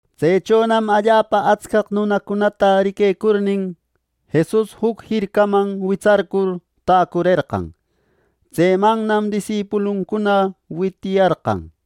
Tsechonam allapa atscaq nunacunata riquecurnin, Jesus juc jircaman witsarcur täcurerqan. Tsemannam disipuluncuna witiyarqan.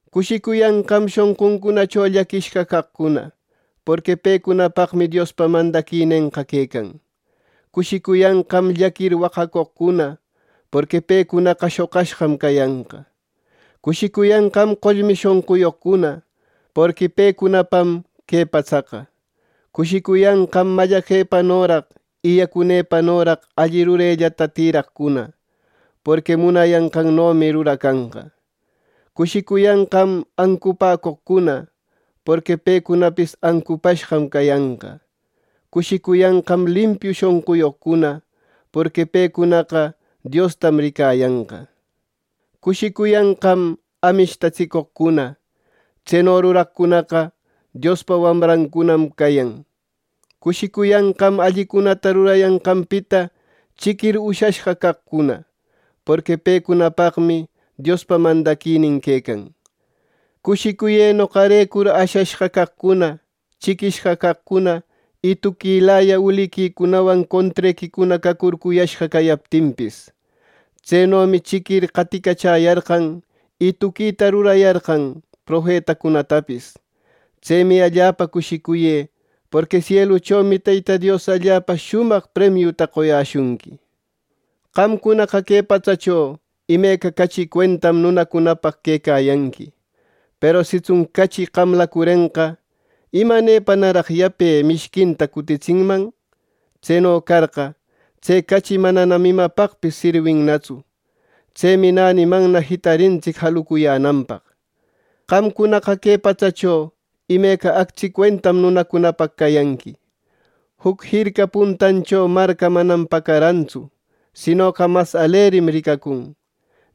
“Cushicuyanqam shonquncunacho llaquishqa caqcuna, porqui pecunapaqmi Diospa mandaquinenqa quecan. Cushicuyanqam llaquir waqacoqcuna, porqui pecunaqa shoqashqam cayanqa. Cushicuyanqam qollmi shonquyoqcuna, porqui pecunapam que patsaqa. Cushicuyanqam mallaqepanoraq y yacunëpanoraq alli rurellata tïraqcuna, porqui munayanqannomi ruracanqa. Cushicuyanqam ancupäcoqcuna, porqui pecunapis ancupashqam cayanqa. Cushicuyanqam limpiu shonquyoqcuna; porqui pecunaqa Diosta ricayanqam. Cushicuyanqam amishtatsicoqcuna; tseno ruraqcunaqa Diospa wamrancunam cayan. Cushicuyanqam allicunata rurayanqanpita chiquir ushashqa caqcuna; porqui pecunapaqmi Diospa mandaquinin quecan. “Cushicuyë noqarecur ashashqa caqcuna, chiquishqa caqcuna y tuquilaya uliquicunawan contrequicuna cacurcuyashqa cayaptinpis. Tsenomi chiquir qaticachäyarqan, y tuquita rurayarqan profetacunatapis. Tsemi allapa cushicuyë, porqui sieluchomi Teyta Dios allapa shumaq premiuta qoyäshunqui. “Qamcunaqa que patsacho imeca cachi cuentam nunacunapaq quecayanqui; peru sitsun cachi qamläcurenqa, ¿imanepanaraq yape mishquinta cutitsinman? Tseno carqa, tse cachi mananam imapaqpis sirwinnatsu. Tsemi nänimanna jitarintsic jarucuyänanpaq. “Qamcunaqa que patsacho imeca actsi cuentam nunacunapaq cayanqui. Juc jirca puntancho marca manam pacarantsu, sinoqa mas alerim ricacun.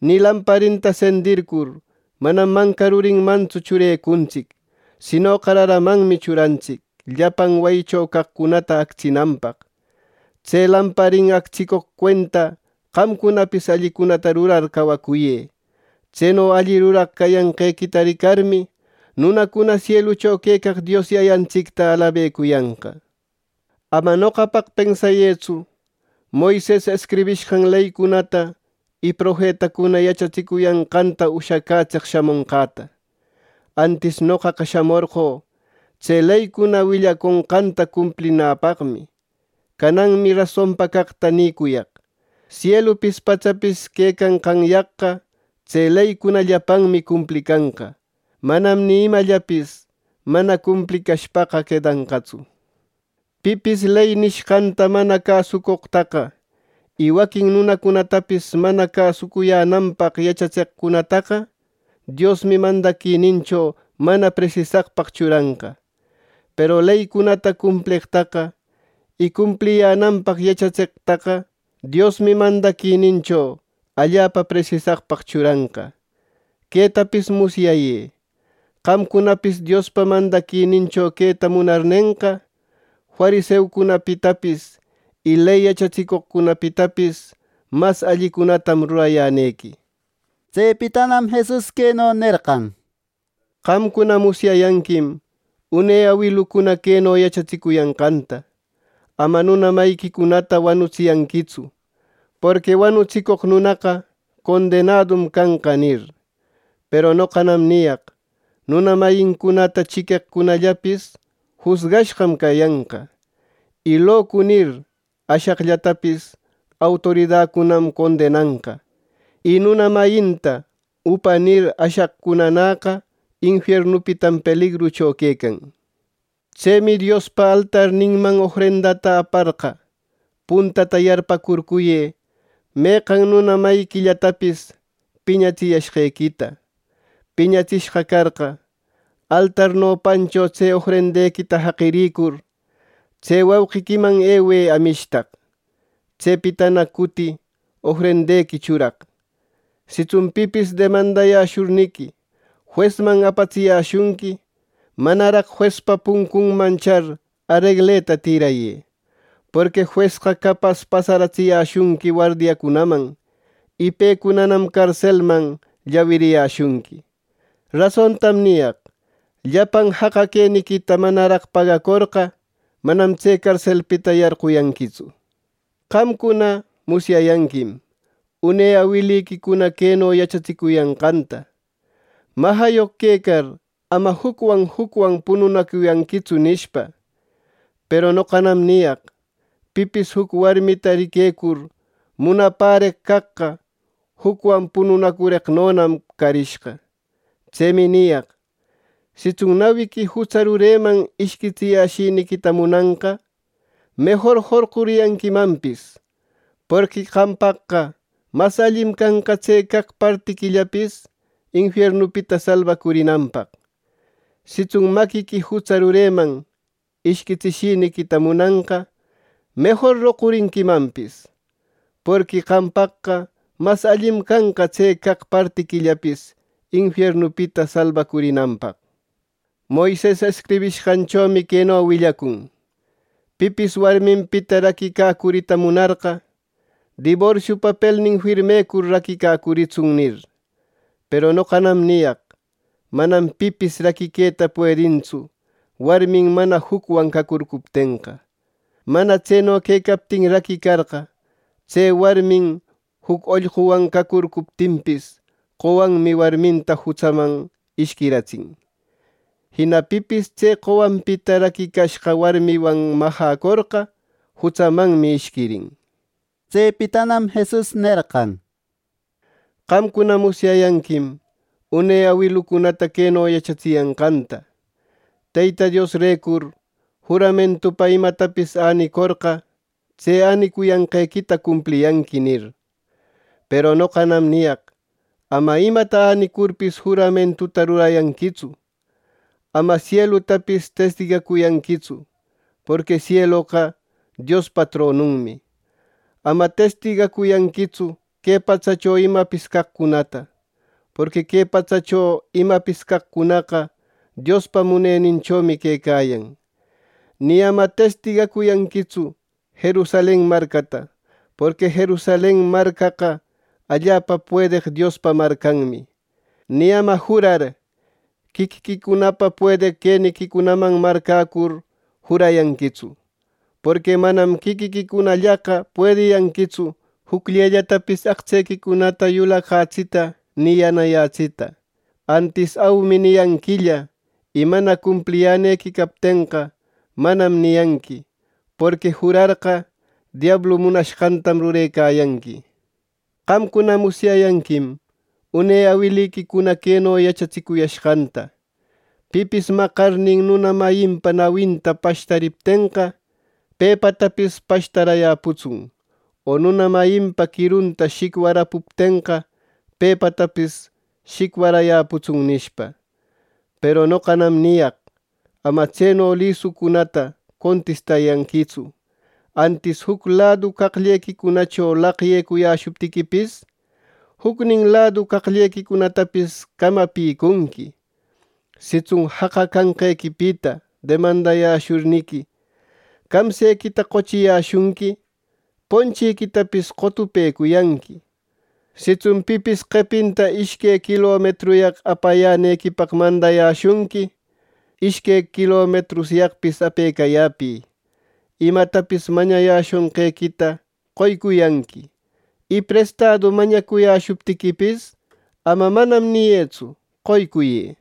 Nï lamparinta sendircur, manam manca rurinmantsu churecuntsic; sinoqa raramanmi churantsic llapan wayicho caqcunata actsinanpaq. Tse lamparin actsicoq cuenta qamcunapis allicunata rurar cawacuyë. Tseno alli ruraq cayanqequita ricarmi, nunacuna sielucho quecaq Dios Yayantsicta alabecuyanqa. “Ama noqapaq pensayëtsu Moises escribishqan leycunata y profetacuna yachatsicuyanqanta ushacätseq shamonqäta. Antis noqaqa shamorqö tse leycuna willaconqanta cumplinäpaqmi. Cananmi rasonpa caqta nïcuyaq. Sielupis patsapis quecanqanyaqqa tse leycuna llapanmi cumplicanqa; manam ni imallapis mana cumplicashpaqa quedanqatsu. Pipis ley nishqanta mana cäsoqtaqa y waquin nunacunatapis mana cäsuyänanpaq yachatseqcunataqa, Diosmi mandaquinincho mana presisaqpaq churanqa. Peru leycunata cumpleqtaqa y cumpliyänanpaq yachatseqtaqa Diosmi mandaquinincho allapa presisaqpaq churanqa. Quetapis musyayë: Qamcunapis Diospa mandaquinincho queta munarnenqa, fariseucunapitapis y ley yachatsicoqcunapitapis mas allicunatam rurayänequi.” Tsepitanam Jesus queno nerqan: “Qamcuna musyayanquim une awilucuna queno yachatsicuyanqanta: ‘Ama nuna mayiquicunata wanutsiyanquitsu, porqui wanutsicoq nunaqa condenadum canqa’ nir. Peru noqanam niyaq nuna mayincunata chiqueqcunallapis jusgashqam canqa; y ‘Locu’ nir ashaqllatapis autoridacunam condenanqa; y nuna mayinta ‘Upa’ nir ashaqcunanäqa infiernupitam peligrucho quecan. “Tsemi Diospa altarninman ofrendata aparqa, puntata yarpäcurcuyë meqan nuna mayiquillatapis piñatsiyashqequita. Piñatsishqa carqa, altar nopancho tse ofrendequita jaqirïcur, tse wauqiquiman ewë amishtaq. Tsepitana cuti ofrendequi churaq. “Sitsun pipis demandashurniqui juesman apatsiyäshunqui, manaraq juespa puncunman char aregleta tïrayë. Porqui juesqa capas pasaratsiyäshunqui wardiacunaman, y pecunanam carselman llawiriyäshunqui. Rasontam niyaq: Llapan jaqa queniquita manaraq pagacorqa, manam tse carselpita yarquyanquitsu. “Qamcuna, musyayanquim une awiliquicuna queno yachatsicuyanqanta, ‘Majayoq quecar ama jucwan jucwan pununacuyanquitsu’ nishpa. Peru noqanam niyaq: Pipis juc warmita riquecur munapäreq caqqa, jucwan punanacureqnonam carishqa. “Tsemi niyaq: Sitsun nawiqui jutsa rureman ishquitsishiniquita munanqa, mejor jorqurinquimanpis; porqui qampaqqa mas allim canqa tse caq partiquillapis infiernupita salbacurinanpaq. Sitsun maquiqui jutsa rureman ishquitsishiniquita munanqa, mejor roqurinquimanpis; porqui qampaqqa mas allim canqa tse caq partiquillapis infiernupita salbacurinanpaq. “Moises escribishqanchomi queno willacun: ‘Pipis warminpita raquicacurita munarqa, diborsio papelnin firmecur raquicacuritsun’ nir. Peru noqanam niyaq: Manam pipis raquiqueta puedintsu warmin mana jucwan cacurcuptenqa. Mana tseno quecaptin raquicarqa, tse warmin juc ollquwan cacuriptinpis, qowanmi warminta jutsaman ishquiratsin. Jina pipis tse qowanpita raquicashqa warmiwan majäcorqa, jutsamanmi ishquirin.” Tsepitanam Jesus nerqan: “Qamcuna musyayanquim une awilucunata queno yachatsiyanqanta: ‘Teyta Diosrecur juramentupa imatapis änicorqa, tse änicuyanqequita cumpliyanqui’ nir. Peru noqanam niyaq: Ama imata änicurpis juramentuta rurayanquitsu. Ama sielutapis testigacuyanquitsu; porqui sieloqa Diospa tronunmi. Ama testigacuyanquitsu que patsacho imapis caqcunata; porqui que patsacho imapis caqcunaqa, Diospa muneninchomi quecayan. Ni ama testigacuyanquitsu Jerusalen marcata; porqui Jerusalen marcaqa allapa puedeq Diospa marcanmi. Ni ama jurar quiquiquicunapa puedeq queniquicunaman marcäcur jurayanquitsu; porqui manam quiquiquicunallaqa puediyanquitsu jucllellatapis aqtsequicunata yulaqyätsita, ni yanayätsita. Antis ‘aumi’ niyanquilla, y mana cumpliyänequi captenqa ‘manam’ niyanqui. Porqui jurarqa, diablu munashqantam rurecayanqui. “Qamcuna musyayanquim une awiliquicuna queno yachatsicuyashqanta: ‘Pipis maqarnin nuna mayinpa nawinta pashtariptenqa, pepatapis pashtarayäputsun; o nuna mayinpa quirunta shicwarapuptenqa, pepatapis shicwarayäputsun’ nishpa. Peru noqanam niyaq: Ama tseno lisucunata contistayanquitsu, antis juc ladu qaqllequicunacho laqyecuyäshuptiquipis, jucnin ladu qaqllequicunatapis camapicunqui. Sitsun jaqa canqequipita demandashurniqui, camsequita qochiyäshunqui, ponchiquitapis qotupecuyanqui. Sitsun pipis qepinta ishque quilometruyaq apayänequipaq mandayäshunqui, ishque quilometruyaqpis apecayäpï. Imatapis mañayäshonqequita qoycuyanqui. Y prestadu mañacuyäshuptiquipis, ama ‘manam’ niyëtsu; qoycuyë.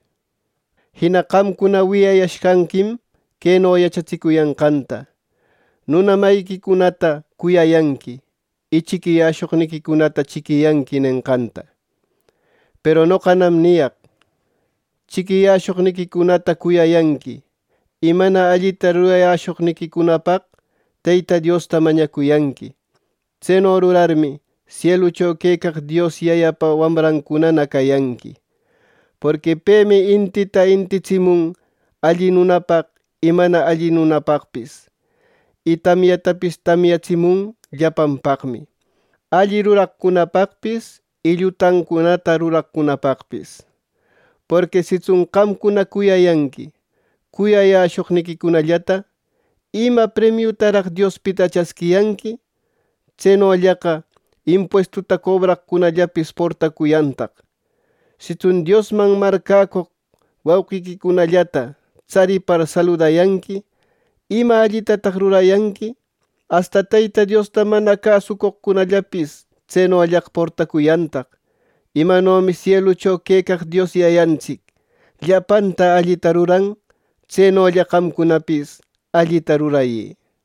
“Jina qamcuna wiyayashqanquim queno yachatsicuyanqanta: ‘Nuna mayiquicunata cuyayanqui, y chiquiyashoqniquicunata chiquiyanqui’ nenqanta. Peru noqanam niyaq: Chiquiyäshoqniquicunata cuyayanqui, y mana allita rurayashoqniquicunapaq Teyta Diosta mañacuyanqui. Tseno rurarmi, sielucho quecaq Dios Yayapa wamrancunana cayanqui. Porqui pemi intinta intitsimun alli nunapaq y mana alli nunapaqpis. Y tamyantapis tamyatsimun llapanpaqmi: alli ruraqcunapaqpis y llutancunata ruraqcunapaqpis. Porqui sitsun qamcuna cuyayanqui cuyayäshoqniquicunallata, ¿ima premiutaraq Diospita chasquiyanqui! ¡Tsenollaqa impuestuta cobraqcunallapis portacuyantaq! Sitsun Diosman marcäcoq wauqiquicunallata tsaripar saludayanqui, ¿ima allitataq rurariyanqui! ¡Asta Teyta Diosta mana cäsucoqcunallapis tsenollaqa portacuyantaq! Imanomi sielucho quecaq Dios Yayantsic llapanta allita ruran, tsenolla qamcunapis allita rurayë.